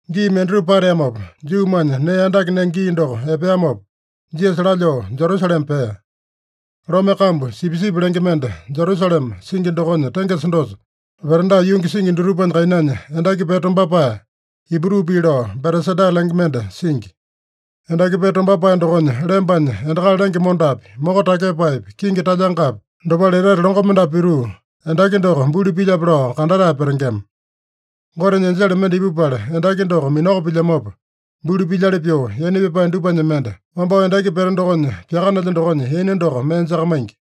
Gii mendatupa pateamopa, Juumanya nee andake nenge gii doko epeamopa, Jisasa lalyoo Jerusalema pea. Lome kambu Sipisipi lenge mende Jerusalema singi dokonya tengesa dosa, veranda yungi singi dutupanya kainanya endaki pete tombapae, Ibru pii lao Betesada lenge mende singi. Endaki pete tombapae dokonya lembanya endakali lenge mondapi, moko takyepaepi, kingi talyangapi, dopale etete longo mendapu pituu, endaki doko buli pilyape lao kandatae petengema. Gotenya enjele mende ipupala endaki doko minako pilyamopa, buli pilyali pyoo, yaina pyapae dupanya mende, wambao endaki pete dokonya pyakanelya dokonya yaina doko mee jakamaingi.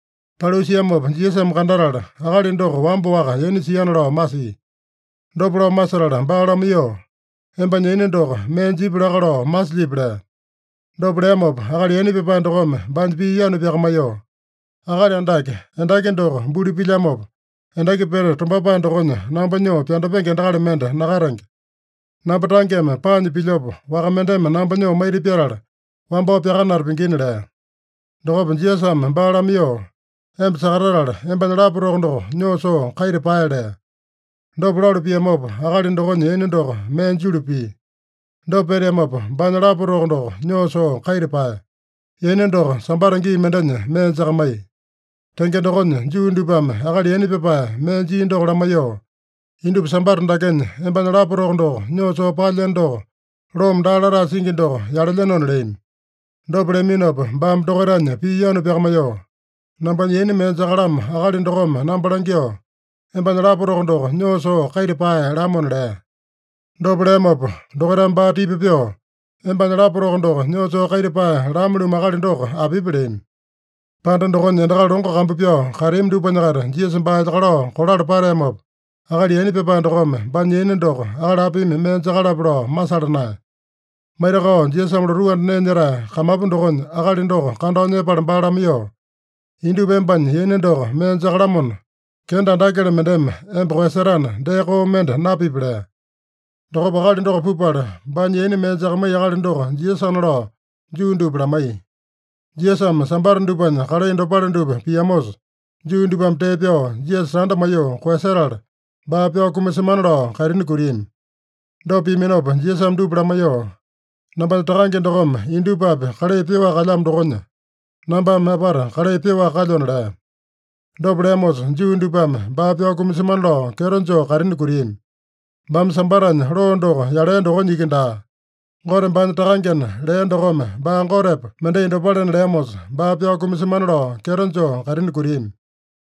Paliu siamopa Jisasame kandatala, akali doko wamba-waka yaina siana lao masia. Dopa lao masetala baa lamaiyoo, “Embanya yaina doko mee jipya laka lao masilyipi?” lea. Dopa leamopa akali yaina pyapae dokome baanya pii yanu pyakamaiyoo, “Akali Andake, endaki doko buli pilyamopa, endaki pete tombapae dokonya namba nyoo pyandapenge endakali mende nakatenge. Namba tangeme paanya pilyopa, waka mendeme namba nyoo maita pyatala wambao pyakanata pingina” lea. Dokopa Jisasame baa lamaiyoo, “Emba sakatatala, embanya lapa toko doko nyoo soo kaita pae” lea. Dopa lalu piamopa, akali dokonya yaina doko mee julu pia. Dopa peteamopa, baanya lapa toko doko nyoo soo kaita paeya. Yaina doko Sambata gii mendenya mee jakamaiya. Tenge dokonya, Juu dupame akali yaina pyapae mee jia doko lamaiyoo, “Indupa Sambata dakenya embanya lapa toko doko nyoo soo paelyeno doko, loome daa latae singi doko yalelyenona” leami. Dopa leaminopa baame dokaitanya pii yanu pyakamaiyoo, “Nambanya yaina mee jakalamo akali dokome namba langyoo, ‘Embanya lapa toko doko nyoo soo kaita pae’ lamona” lea. Dopa leamopa dokaitame baa tipa pyoo, “Embanya lapa toko doko nyoo soo kaita pae lame-lumu akali doko apipi?” leami. Panda dokonya endakali longo kambu pyao kateami dupanya-kaita Jisasa baa elyakalao kolala pateamopa, akali yaina pyapae dokome baanya yaina doko akali apimi mee jakalape lao masala naeya. Maitakao Jisasame lotuu anda nee nyetae kamapu dokonya akali doko kandao nyepala baa lamaiyoo, “Indupa embanya yaina doko mee jakalamona, kenda andakele mendeme emba koeyasetana, dee koo mende napipi” lea. Dokopa akali doko pupala, baanya yaina mee jakamaiya akali doko Jisasana lao Juu dupa lamaiya. Jisasame Sambata dupanya kalai dopale dupa piamosa, Juu dupame tee pyao Jisasa tanda maiyoo koeyasetala, baa pyao kumasemana lao kaitini kutiami. Dopa piaminopa Jisasame dupa lamaiyoo, “Nambanya Takange dokome indupapi kalai pyoaka kalyamo dokonya, nambame apata kalai pyoaka kalyona” lea. Dopa leamosa, Juu dupame baa pyao kumasemana lao kyeto joo kaitini kutiami. Baame Sambatanya loo doko yalea dokonya iki daa, Gote baanya Takangena lea dokome baa Gotepa mendai dopalena leamosa, baa pyao kumasemana lao kyeto joo kaitini kutiami.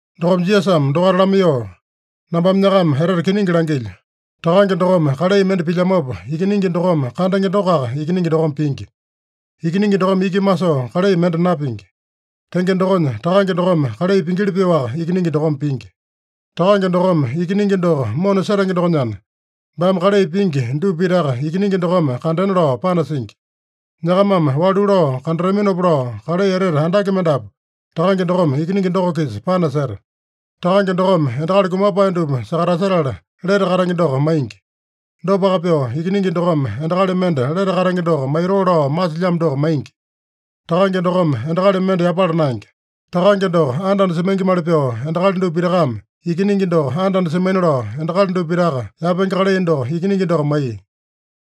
Dokopa Jisasame dokaita lamaiyoo, “Nambame nyakama etete kiningi langilyo: Takange dokome kalai mende pilyamopa, Ikiningi dokome kandenge dokoaka Ikiningi dokome pingi. Ikiningi dokome iki masoo kalai mende napingi. Tenge dokonya, Takange dokome kalai pingili pyoaka Ikiningi dokome pingi. Takange dokome Ikiningi doko mona setenge dokonyana, baame kalai pingi dupa pitaka Ikiningi dokome kandena lao panasingi. Nyakamame walu lao kandataminopa lao, kalai etete andake mendapu Takange dokome Ikiningi doko-kisa panaseta. Takange dokome endakali kumapae dupa sakatasetala lete katenge doko maingi. Dopaka pyoo, Ikiningi dokome endakali mende lete katenge doko maitoo lao masilyamo doko maingi. Takange dokome endakali mende yapala naenge. Takange doko anda-anda semaingimali pyoo endakali dupa pitakame Ikiningi doko anda-anda semaina lao endakali dupa pitaka yapenge kalai doko Ikiningi doko maiya.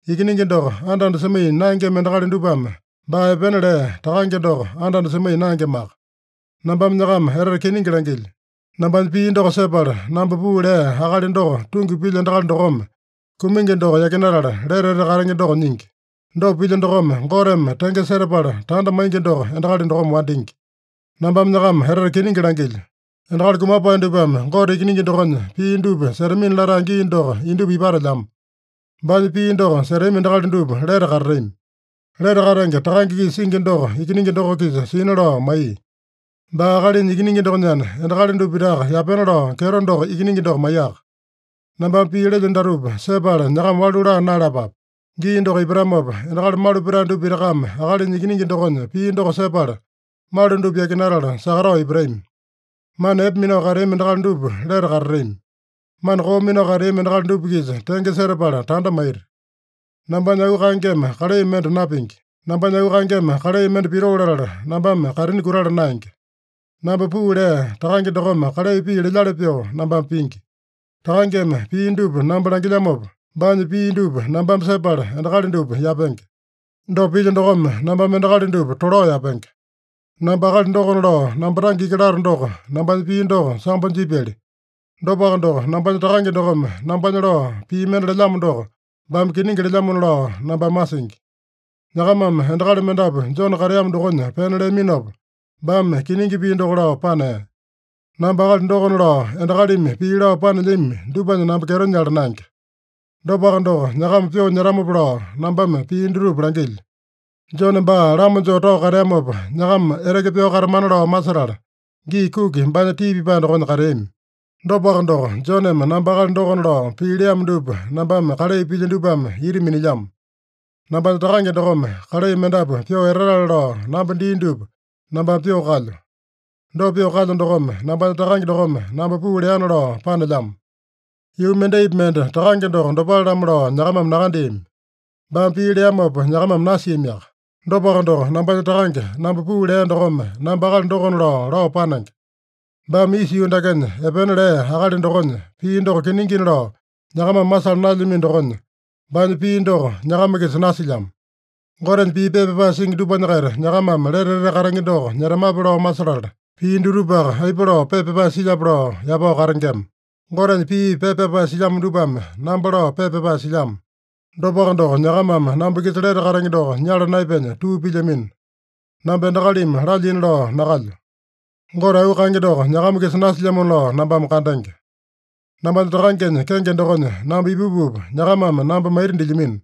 Ikiningi doko anda-anda semaiya naengema endakali dupame baa epena lea Takange doko anda-anda semaiya naengemaka. Nambame nyakama etete kiningi langilyo: Nambanya pii doko sepala, namba puu lea Akali doko tungi pilya endakali dokome, kumingi doko yakinatala, lete etete katenge doko nyingi. Dopa pilya dokome, Goteme tenge setapala tanda maingi doko endakali dokome wandingi. “Nambame nyakama etete kiningi langilyo: Endakali kumapae dupame Gote Ikiningi dokonya pii dupa setamina latae gii doko indupa ipatelyamo. Baanya pii doko setami endakali dupa lete katatami. Lete katenge Takange-kisa singi doko Ikiningi doko-kisa sina lao maiya. Baa Akalinya Ikiningi dokonyana, endakali dupa pitaka yapena lao kyeto doko Ikiningi doko maiyaka. Nambame pii lelyo datupa sepala nyakama walu laa naeyalapape. Gii doko ipatamopa, endakali malu petae dupa pitakame Akalinya Ikiningi dokonya pii doko sepala, malu dupa yakinatala sakatao ipatami. Mana epe minao kateami endakali dupa lete katatami. Mana koo minao kateami endakali dupa-kisa tenge setapala tanda maita. “Nambanya auu kaengeme kalai mende napingi. Nambanya auu kaengeme kalai mende pitoo latala nambame kaitini kutala naenge. Namba puu lea Takange dokome kalai pii lelyali pyoo, nambame pingi. Takangeme pii dupa namba langilyamopa, baanya pii dupa nambame sepala endakali dupa yapenge. Dopa pilyo dokome, nambame endakali dupa tolao yapenge. “Namba akali dokona lao namba tange iki lato doko, nambanya pii doko sambo jipyali. Dopaka doko, nambanya Takange dokome nambanya lao pii mende lelyamo doko, baame kiningi lelyamona lao nambame masingi. Nyakamame endakali mendapu Jone kateamo dokonya pena leaminopa, baame kiningi pii doko lao panea. Namba akali dokona lao endakalimi pii lao panelyami dupanya namba kyeto nyala naenge. Dopaka doko, nyakama pyoo nyetamopa lao nambame pii dutupa langilyo. Jone baa lama joo tao kateamopa, nyakama eteke pyao katamana lao masetala, gii kuki baanya tii pipae dokonya kateami. Dopaka doko, Joneme namba akali dokona lao pii leamo dupa nambame kalai pilyo dupame ita minilyamo. Nambanya Takange dokome kalai mendapu pyoo etatale lao namba dia dupa nambame pyoo kalyo. Dopa pyoo kalyo dokome, nambanya Takange dokome namba puu leana lao panelyamo. Yuu mendaipi mende Takange doko dopale-lamo lao nyakamame nakandeami. Baame pii leamopa nyakamame nasiamiaka. Dopaka doko, nambanya Takange, namba puu lea dokome namba akali dokona lao, lao panenge. Baame isa yuu dakenya epena lea akali dokonya pii doko kiningina lao nyakamame masala naelyamino dokonya, baanya pii doko nyakama-kisa nasilyamo. Gotenya pii pepa pyapae singi dupanya-kaita nyakamame lete etete katenge doko nyetamape lao masetala, pii dutupaka aipa lao pepa pyapae silyape lao yapao katengema. Gotenya pii pepa pyapae silyamo dupame namba lao pepa pyapae silyamo. Dopaka doko, nyakamame namba-kisa lete katenge doko nyala naepenya tuu pilyamino. Namba endakalimi lalyina lao nakalyo. Gote auu kaenge doko nyakama-kisa nasilyamona lao nambame kandenge. Nambanya Takangenya kenge dokonya namba ipupupa, nyakamame namba maita dilyamino.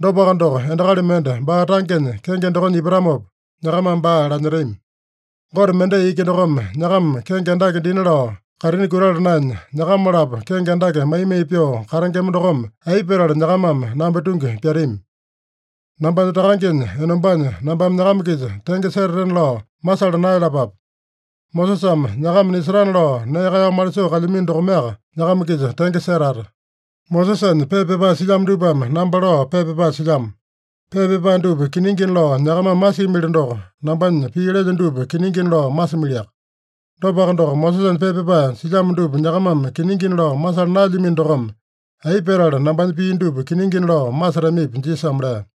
Dopaka doko, endakali mende baa tangenya kenge dokonya ipatamopa, nyakamame baa lanyetami. Gote mendai iki dokome nyakama kenge andake dina lao kaitini kutala naenya, nyakama-lapo kenge andake mai-mai pyoo katengema dokome, aipa petala nyakamame namba tungi pyatami? Nambanya Takangenya enombanya nambame nyakama-kisa tenge setatena lao masala naeyalapape. Mosesame nyakama nisetana lao nee kaeyao malisoo kalyamino dokomeaka nyakama-kisa tenge setata. Mosesanya pepa pyapae silyamo dupame namba lao pepa pyapae silyamo. Pepa pyapae dupa kiningina lao nyakamame masimili doko, nambanya pii lelyo dupa kiningina lao masimiliaka. Dopaka doko, Mosesanya pepa pyapae silyamo dupa nyakamame kiningina lao masala naelyamino dokome, aipa petala nambanya pii dupa kiningina lao masetamipi?” Jisasame lea.